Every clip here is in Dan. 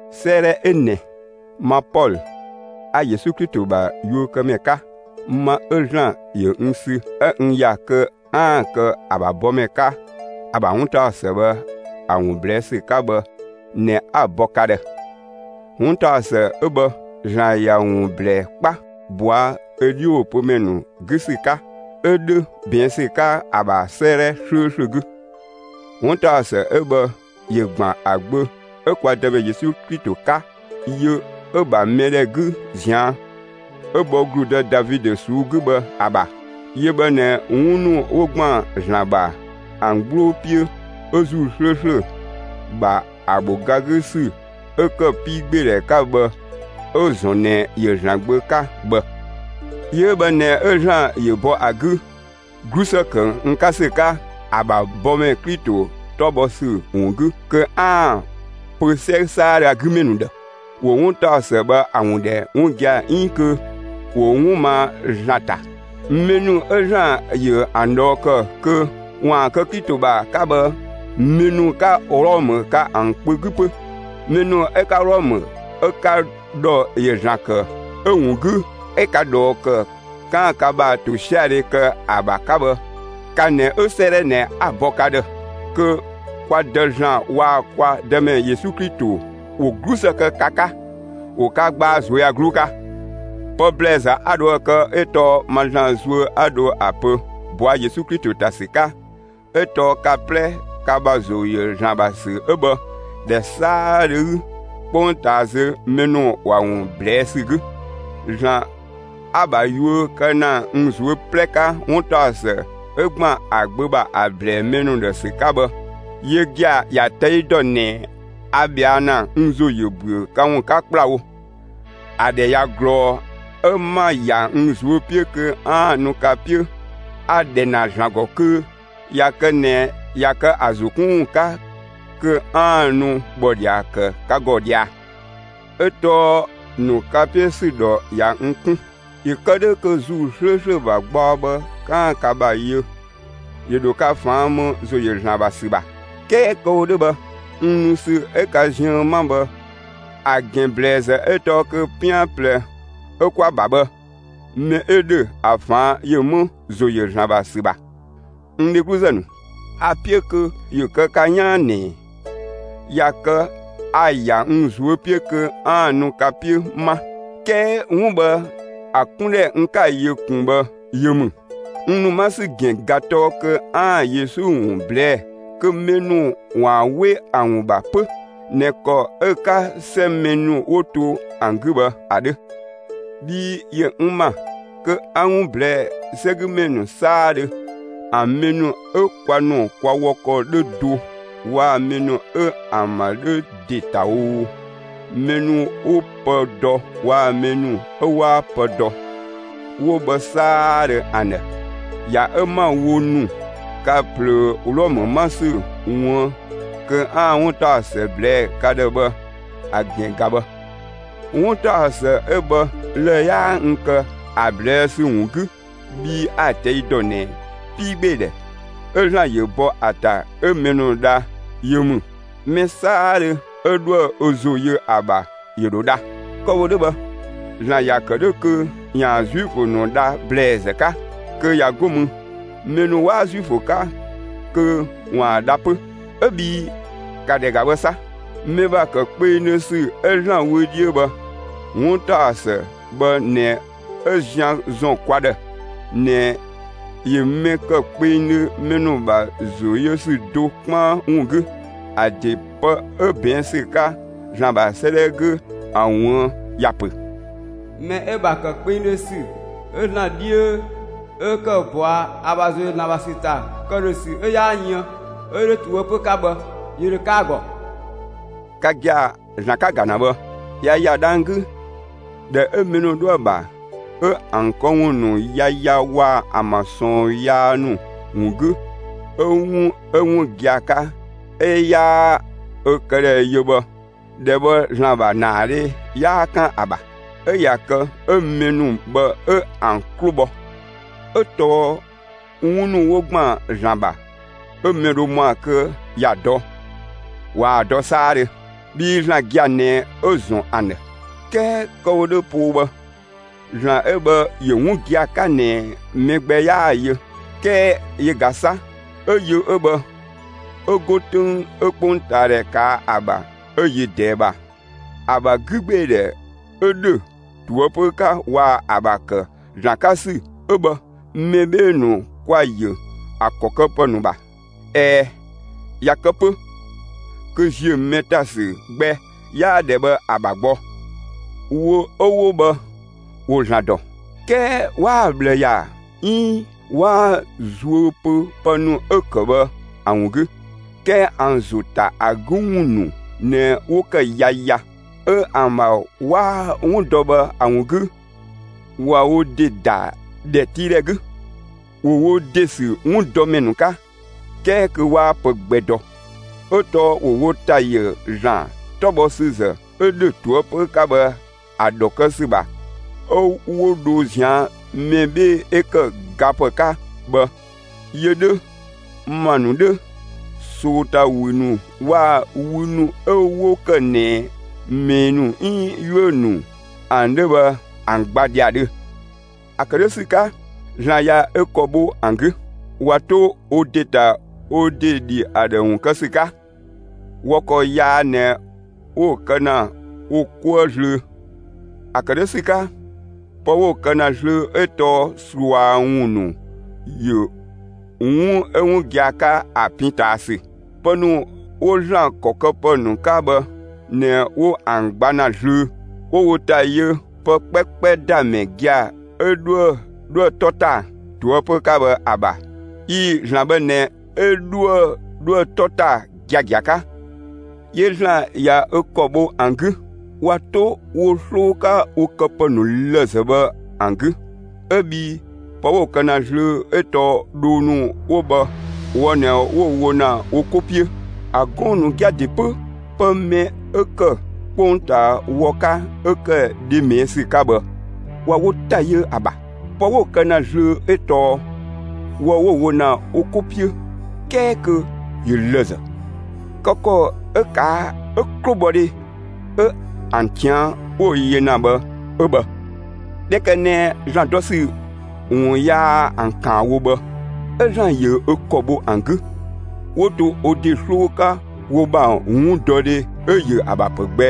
'Sëëdhɛ ö ꞊nɛ, ma Pɔlö, 'a Yesu Klito ‑bha yuökëmɛ 'ka, ma 'ö ‑Zlan ‑yö n sü 'ö n ‑ya kö 'aan‑ kë ‑a ‑bha bɔmɛ 'ka ‑a ‑bha 'wuntaɔsë bhë ‑a ‑wun ꞊blɛɛ' ‑sü 'ka bhë ꞊nɛ 'a‑ bɔ ka ‑dhë. 'Wuntaɔsë 'ö bhë ‑Zlan ‑ya ‑wun ‑blɛɛ 'kpa, ꞊bɔa' ö 'dhiwopömɛ ‑nu 'gü ‑sü 'ka; 'ö 'dhö ꞊bɛɛn' ‑sü 'ka ‑a ‑bha 'sëëdhɛ 'slööslö 'gü. 'Wuntaɔsë 'ö bhë ‑yö ‑gban ‑a Gbö 'ö kwa Dëmɛ Yesu Klito 'ka, yö 'ö‑ ‑bha mɛ ‑dhɛ 'gü ꞊zian' 'ö bhɔ ‑gludë Davidö ꞊suu'‑ 'gü bhë ‑a ‑bha. Yö bhë ꞊nɛ 'wun ‑nu 'wo ‑gban ‑Zlan ‑bha ‑an 'gbloo 'piö 'ö ‑Zuu 'slööslö ‑bha ‑a ‑bho ga 'gü ‑sü 'ö ‑kë 'piigbeedhɛ 'ka bhë 'ö‑ ‑zɔn ꞊nɛ ‑yö ‑Zlan Gbö 'ka bhë. Yö 'ö bhë ꞊nɛ 'ö ‑Zlan ‑yö bɔ ‑a 'gü, 'glusë ‑kë n 'ka ‑sü 'ka ‑a ‑bha bɔmɛ Klito 'tɔ bhɔ ‑sü ‑wun 'gü kö 'aan‑ pö 'sɛ 'saadhö 'gü ‑mɛ ‑nu ‑dhë, ‑wo 'wuntaɔsë bhë ‑a ‑wun ‑dhɛ 'wun gia‑ 'iin kö ‑wo 'wun ma ‑Zlan ‑ta. Mɛ ‑nu 'ö ‑Zlan ‑yö ‑an ꞊dhɔɔ ‑kë kö ‑waan kë Klito ‑bha 'ka bhë, mɛ ‑nu 'ka Wlɔmë ka ‑an kpö 'gü 'pö. Mɛ ‑nu 'ö 'ka Wlɔmë 'ö ka ‑dhɔ ‑yö ‑Zlan ‑kë 'ö‑ ‑wun 'gü 'ö ka ꞊dhɔɔ ‑kë kö 'kaan‑ ka ‑bha ‑tosiadhe kë ‑a ‑bha 'ka bhë, ka ꞊nɛ 'ö 'sëëdhɛ ꞊nɛ 'a‑ bɔ ka ‑dhë. Kö kwa Dë ‑Zlan waa‑ kwa Dëmɛ Yesu Klito ‑wo 'glusë kë ka 'ka, ‑wo ka gbaa ꞊zuöyagluu 'ka. Pë ‑blɛɛzë 'a dhoë‑ kë 'ö tɔɔ ma ‑Zlan zuö 'a dhö ‑a pö ꞊bɔa' Yesu Klito ‑ta ‑sü 'ka 'ö tɔɔ ka 'plɛ ka ‑bha ‑zo ‑yö ‑Zlan ‑bha ‑sü 'ö bhë, ‑dhɛ 'saadhö 'gü 'kpongtaa zö, mɛ ‑nu ‑wa ‑wun ꞊blɛɛ' ‑sü 'gü. ‑Zlan 'a‑ ‑bha yuö kë ‑na n ꞊zuö' 'plɛ 'ka, 'wuntaɔsë 'ö ‑gban ‑a Gbö ‑bha ‑a ‑blɛɛ mɛ ‑nu ‑dhë ‑sü 'ka bhë, yö gia‑ ‑ya ꞊tɛi' ‑dɔ ꞊nɛ a ꞊bhɛa' ‑na, n ‑zo ‑yö ‑büö ka ‑wun 'ka ‑kplawo. ‑A ‑dhɛ ꞊ya ꞊glɔɔ 'ö 'ma‑ ‑ya n ꞊zuö' 'piö kö 'aan‑ nu ka 'piö. A‑ ‑dhɛ ‑na ‑Zlan ‑gɔ kö ꞊ya kë ꞊nɛ ꞊ya kë ‑a ‑zo 'kun ‑wun 'ka, kö 'aan‑ nu ‑bhɔdhia kë ka ‑gɔ ꞊dhia. 'Ö tɔɔ ‑nu ka 'piö ‑sü ‑dhɔ ꞊ya n 'kun, ‑yö kë 'dhö kö ‑Zuu 'slööslö ‑bha gbaɔ bhë 'kaan‑ ka ‑bha yö; ‑yö ‑dho ka ꞊faan' ‑më ‑zo ‑yö ‑Zlan ‑bha ‑sü ‑bha. 'Kɛɛ kë‑ wo 'dhö bhë, n nu ‑sü 'ö ka ziën 'ma bhë, ‑a ‑gɛn ‑blɛɛzë 'ö tɔɔ kö 'pian ꞊plɛ 'ö 'kwa‑ ‑bha bhë, mɛ 'ö ‑dhö ‑a ꞊faan' ‑yö 'më ‑zo ‑yö ‑Zlan ‑bha ‑sü ‑bha. N dhegluzë ‑nu, a‑ 'piö kö ‑yö kë ka 'yaan ꞊nɛ, ꞊ya kë a‑ ‑ya n ꞊zuö' 'piö kö 'aan‑ nu ka 'piö 'ma; 'kɛɛ 'wun bhë ‑a 'kundhɛ n 'ka‑ yö ꞊kun bhë yö ‑mü. N ‑nu 'ma ‑sü ‑gɛn ꞊ga tɔɔ kö 'aan‑ Yesu ‑wun ꞊blɛɛ'‑ kö mɛ ‑nu ‑waan 'we ‑a ‑wun ‑bha 'pö ꞊nɛ ‑kɔ 'ö‑ 'ka 'sɛ mɛ ‑nu 'wo to ‑an 'gü bhë ‑a 'dhö. Bhii ‑yö n ‑ma kö 'a‑ 'wun ꞊blɛɛ' 'sɛgümɛ ‑nu 'saadhö, ‑an mɛ ‑nu 'ö kwa ‑nu kwa wɔ ‑kɔ 'dhö do waa‑ mɛ ‑nu 'ö ‑an ‑bha 'dhö ‑de ‑ta oo, mɛ ‑nu 'wo pë dɔ waa‑ mɛ ‑nu 'ö 'waa pë dɔ, 'wo bhë 'saadhö ‑an ‑dhë. ‑Ya 'ö 'ma‑ wo ‑nu ka ꞊plöö Wlɔmë 'ma ‑sü ꞊wuën' kö 'aan‑ 'wuntaɔsë ꞊blɛɛ'‑ ka ‑dhë bhë, ‑a ‑gɛn ꞊ga bhë. 'Wuntaɔsë 'ö bhë lë‑ 'yaa n kë ‑a ꞊blɛɛ'‑ sü ‑wun 'gü; bhii a‑ ꞊tɛi' ‑dɔ ꞊nɛ 'piigbeedhɛ 'ö ‑Zlan ‑yö bɔ ‑a ‑ta 'ö mɛ ‑nu dha yö ‑mü; mɛ 'saadhö 'ö 'dhoë‑ ö ‑zo yö ‑a ‑bha ‑yö ‑dho dha. Kë‑ wo 'dhö bhë, ‑Zlan ‑ya ‑kë 'dhö kö ‑yaan Zuifö ‑nu dha ‑blɛɛzë 'ka, kö ꞊ya 'go mü, mɛ ‑nu 'waa Zuifö 'ka kö ‑waan dha 'pö. 'Ö bhii ‑ka ‑dhɛ ‑ga bhë 'sa, mɛ ‑bha ‑kë kpengdhö ‑sü 'ö ‑Zlan wö 'dhiö bhë, 'wuntaɔsë bhë ꞊nɛ 'ö zian ‑zɔn kwa ‑dhë ꞊nɛ ‑yö mɛ ‑kë kpengdhö mɛ ‑nu ‑bha ‑zo yö ‑sü do 'kpaan ‑wun 'gü. ‑A ‑de pë 'ö ꞊bɛɛn' ‑sü 'ka ‑Zlan ‑bha 'sëëdhɛ 'gü ‑a ꞊wuën' ‑ya ‑pö: Mɛ 'ö‑ ‑bha ‑kë kpengdhö ‑sü 'ö ‑Zlan 'dhiö 'ö ‑kë bɔa ‑a ‑bha ‑zo ‑yö ‑Zlan ‑bha ‑sü ‑ta, ‑këdhösü 'ö 'yaa yën ('ö ‑dhö ꞊toëpö 'ka bhë), ‑yö ‑dho kë ‑a ‑gɔ. Ka gia‑, ‑Zlan 'ka‑ ‑ga ‑na bhë, ꞊ya ‑ya dhang‑ 'gü, ‑dhɛ 'ö mɛ ‑nu 'dhoë‑ ‑bha, 'ö ‑an këwun ‑nu yaya waa‑ ‑an ‑bha ꞊sɔɔn yaa ‑nu ‑wun 'gü, 'ö 'wun 'ö 'wun gia‑ 'ka 'ö 'yaa ö këdhɛ yö bhë, ‑dhɛ bhë ‑Zlan ‑bha ‑naadhe 'yaa 'kan ‑a ‑bha; 'ö ꞊ya kë 'ö mɛ ‑nu bhë 'ö ‑an 'klo bhɔ; 'ö tɔɔ 'wun ‑nu 'wo ‑gban ‑Zlan ‑bha, 'ö mɛ dho ‑mɔa kö ‑ya dɔ, ꞊waa‑ dɔ 'saadhö; bhii ‑Zlan gia‑ ꞊nɛ 'ö‑ ‑zɔn ‑an ‑dhë. 'Kɛɛ kë‑ wo 'dhö poo bhë, ‑Zlan 'ö bhë ‑yö 'wun gia‑ 'ka ꞊nɛ mɛ gbɛ 'yaa‑ yö. 'Kɛɛ yö ꞊ga 'sa 'ö yö 'ö bhë, 'ö 'go 'töng 'ö 'kpongtaadhɛ ꞊kaa' ‑a ‑bha 'ö yö ꞊dɛɛ ‑bha, ‑a ‑bha 'gügbeedhɛ 'ö ‑dhö ꞊toëpö 'ka waa‑ ‑a ‑bha ‑kë ‑Zlan 'ka ‑sü 'ö bhë, mɛ 'bhee‑ ‑nu kwa‑ ‑yö ‑a ‑kɔ këpë ‑nu ‑bha. ꞊Ɛɛ, ꞊ya kë 'pö kö ‑ziö mɛ ‑ta ‑sü gbɛ 'yaa ‑dhɛ bhë ‑a ‑bha gbɔ. Wo 'ö 'wo bhë ‑wo ‑Zlan ‑dɔ; 'kɛɛ 'waa‑ ꞊bhlë ‑ya 'iin 'waa‑ zuö pö pë ‑nu 'ö‑ ‑kë bhë ‑a ‑wun 'gü; 'kɛɛ ‑an ‑zo ‑ta ‑a 'gü ‑wun ‑nu ꞊nɛ 'wo ‑kë yaya; 'ö ‑an ‑bha 'waa 'wun dɔ bhë ‑a ‑wun 'gü ꞊wa wo ‑de ‑da ‑dhɛtiidhɛ 'gü. ‑Wo wo ‑de ‑sü 'wundɔmɛ ‑nu 'ka 'kɛɛ kö 'waa pë gbɛ dɔ. 'Ö tɔɔ ‑wo wo ‑ta ‑yö ‑Zlan 'tɔbhɔsüzë 'ö ‑dhö ꞊toëpö 'ka bhë ‑a ‑dhɔ kë ‑sü ‑bha 'ö 'wo dho ꞊zian' mɛ 'bhee‑ 'ö ‑kë gapë 'ka bhë, yö 'dhö, ‑ma ‑nu 'dhö, ꞊sootawü ‑nu waa‑ wü ‑nu 'ö 'wo ‑kë ꞊nɛ ꞊mɛɛ ‑nu 'iin 'yuö‑ ‑nu ‑an 'dhö bhë ‑an gba ‑dhiadhö. ‑A ‑kë 'dhö ‑sü 'ka, ‑Zlan ꞊ya ö ‑kɔ bho ‑an 'gü; ꞊wa 'to wo ‑de ‑ta wo ‑de ‑dhi ‑a ‑dhë ‑wun kë ‑sü 'ka. Wɔ ‑kɔ yaa ꞊nɛ 'wo‑ kë ‑na wo 'kuë zlöö. ‑A ‑kë 'dhö ‑sü 'ka, pë 'wo‑ kë ‑na zlöö 'ö tɔɔ ꞊sua ‑wun ‑nu ‑yö 'wun 'ö 'wun gia‑ 'ka ‑a pin ꞊taa ‑sü. Pë ‑nu 'wo ‑Zlan ‑kɔ këpë ‑nu 'ka bhë ꞊nɛ 'wo ‑an gba ‑na zlöö; 'wo wo ‑ta yö pë 'kpɛkpɛ ‑da ‑mɛ gia‑ 'ö 'dhuë‑ 'dhoë‑ 'tɔ ‑ta ꞊toëpö 'ka bhë ‑a ‑bha, ꞊ii‑. ‑Zlan bhë ꞊nɛ 'ö 'dhuë‑ 'dhoë‑ 'tɔ ‑ta giagia 'ka. 'Yö ‑Zlan ꞊ya ö ‑kɔ bho ‑an 'gü, ꞊wa 'to wo 'sloo 'ka wo këpë ‑nu lëzë bhë ‑an 'gü. 'Ö bhii pë 'wo‑ kë ‑na zlöö 'ö tɔɔ dhoo ‑nu 'wo bhë wɔ ꞊nɛ 'wo‑ wo ‑na wo 'ko 'piö. ‑A gɔɔn‑ ‑nu gia‑ ‑de 'pö pë mɛ 'ö ‑kë 'kpongtaa wɔ 'ka 'ö ‑kë dhe ꞊mɛɛ' ‑sü 'ka bhë, ꞊wa wo ‑ta ‑yö ‑a ‑bha; pë 'wo‑ kë ‑na zlöö 'ö tɔɔ wɔ 'wo‑ wo ‑na wo 'ko 'piö 'kɛɛ kö ‑yö lëzë. Kë ‑kɔ 'ö ꞊kaa' 'ö 'klobhɔdhe 'ö ‑an ꞊tian' 'wo‑ yö ‑na bhë 'ö bhë. ꞊Dhɛ ‑kë ꞊nɛ ‑Zlan dɔ ‑sü ‑wun yaa ‑an ‑kaan wo bhë, 'ö ‑Zlan ‑yö ö ‑kɔ bho ‑an 'gü, 'wo to wo ‑de 'sloo 'ka wo ‑bha 'wundɔdhe 'ö‑ ‑yö ‑a ‑bha ‑pë gbɛ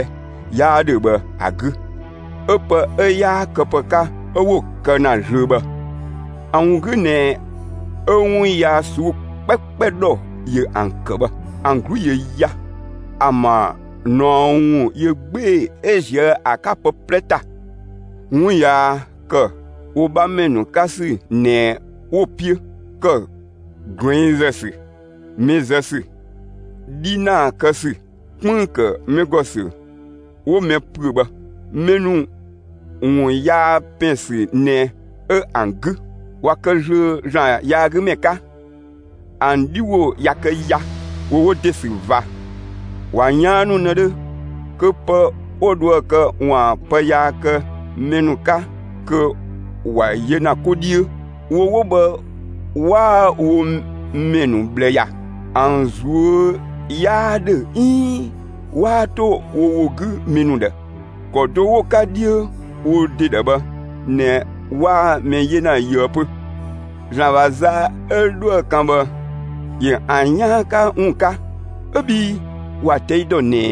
'yaa 'dhö bhë ‑a 'gü 'ö pë 'ö 'yaa këpë 'ka 'ö 'wo‑ kë ‑na zlöö bhë. ‑A ‑wun 'gü ꞊nɛ 'ö 'wun yaa ꞊suu'‑ 'kpɛkpɛ ‑dhɔ ‑yö ‑an ‑kë bhë. ‑An 'glu ‑yö ya; ‑an ‑bha ꞊naɔ ‑wun ‑yö 'gbee‑ 'ö ‑ziö ‑a 'ka pë 'plɛ ‑ta. 'Wun yaa ‑kë wo 'bhamɛ ‑nu 'ka ‑sü ꞊nɛ 'wo‑ 'piö; ‑kë ꞊gluɛngzë ‑sü, mɛ zë ‑sü, 'dhinaa kë ‑sü, 'kpënng‑ ‑kë mɛ ‑gɔ ‑sü 'wo mɛ ‑püö bhë. Mɛ ‑nu ‑wun yaa ‑pɛn ‑sü ꞊nɛ 'ö ‑an 'gü. ꞊Wa kë zlöö ‑Zlan yaagümɛ 'ka; ‑an 'dhi ‑wo ꞊ya kë ya; ‑wo wo ‑de ‑sü ꞊va. ꞊Wa ꞊yaannu ꞊nëdhö kö pë 'wo dhoë‑ kë ‑waan pë yaa kë mɛ ‑nu 'ka, kö ‑wa yö ‑na 'ko 'dhiö. Wo 'wo bhë 'waa wo ‑mɛ ‑nu ꞊bhlë ‑ya. ‑An ꞊zuö' 'yaa 'dhö 'iin 'waa 'to wo ‑wo 'gü mɛ ‑nu ‑dhë: ‑Kɔ do 'wo‑ 'ka 'dhiö wo ‑de ‑dhë bhë ꞊nɛ 'waa mɛ 'yena yöë 'pö. ‑Zlan ‑bha za 'ö dhoë‑ kan bhë, ‑yö ‑an 'yaan 'ka ‑wun 'ka 'ö bhii ‑wa ꞊tɛi' dɔ ꞊nɛ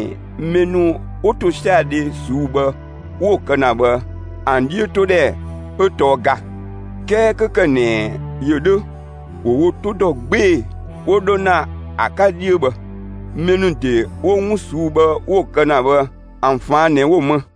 mɛ ‑nu 'wo ‑tosiadhe ꞊suu'‑ bhë 'wo‑ kë ‑na bhë, ‑an 'dhiötodhɛ 'ö tɔɔ ga. 'Kɛɛ 'kö ‑kë ꞊nɛ ‑yö 'dhö, ‑wo wo 'to ‑dɔ 'gbee‑ 'wo 'dho ‑na ‑a 'ka 'dhiö bhë. Mɛ ‑nu ‑de 'wo 'wun ꞊suu'‑ bhë 'wo‑ kë ‑na bhë, ‑an ꞊faan' ꞊nɛ 'wo‑ më.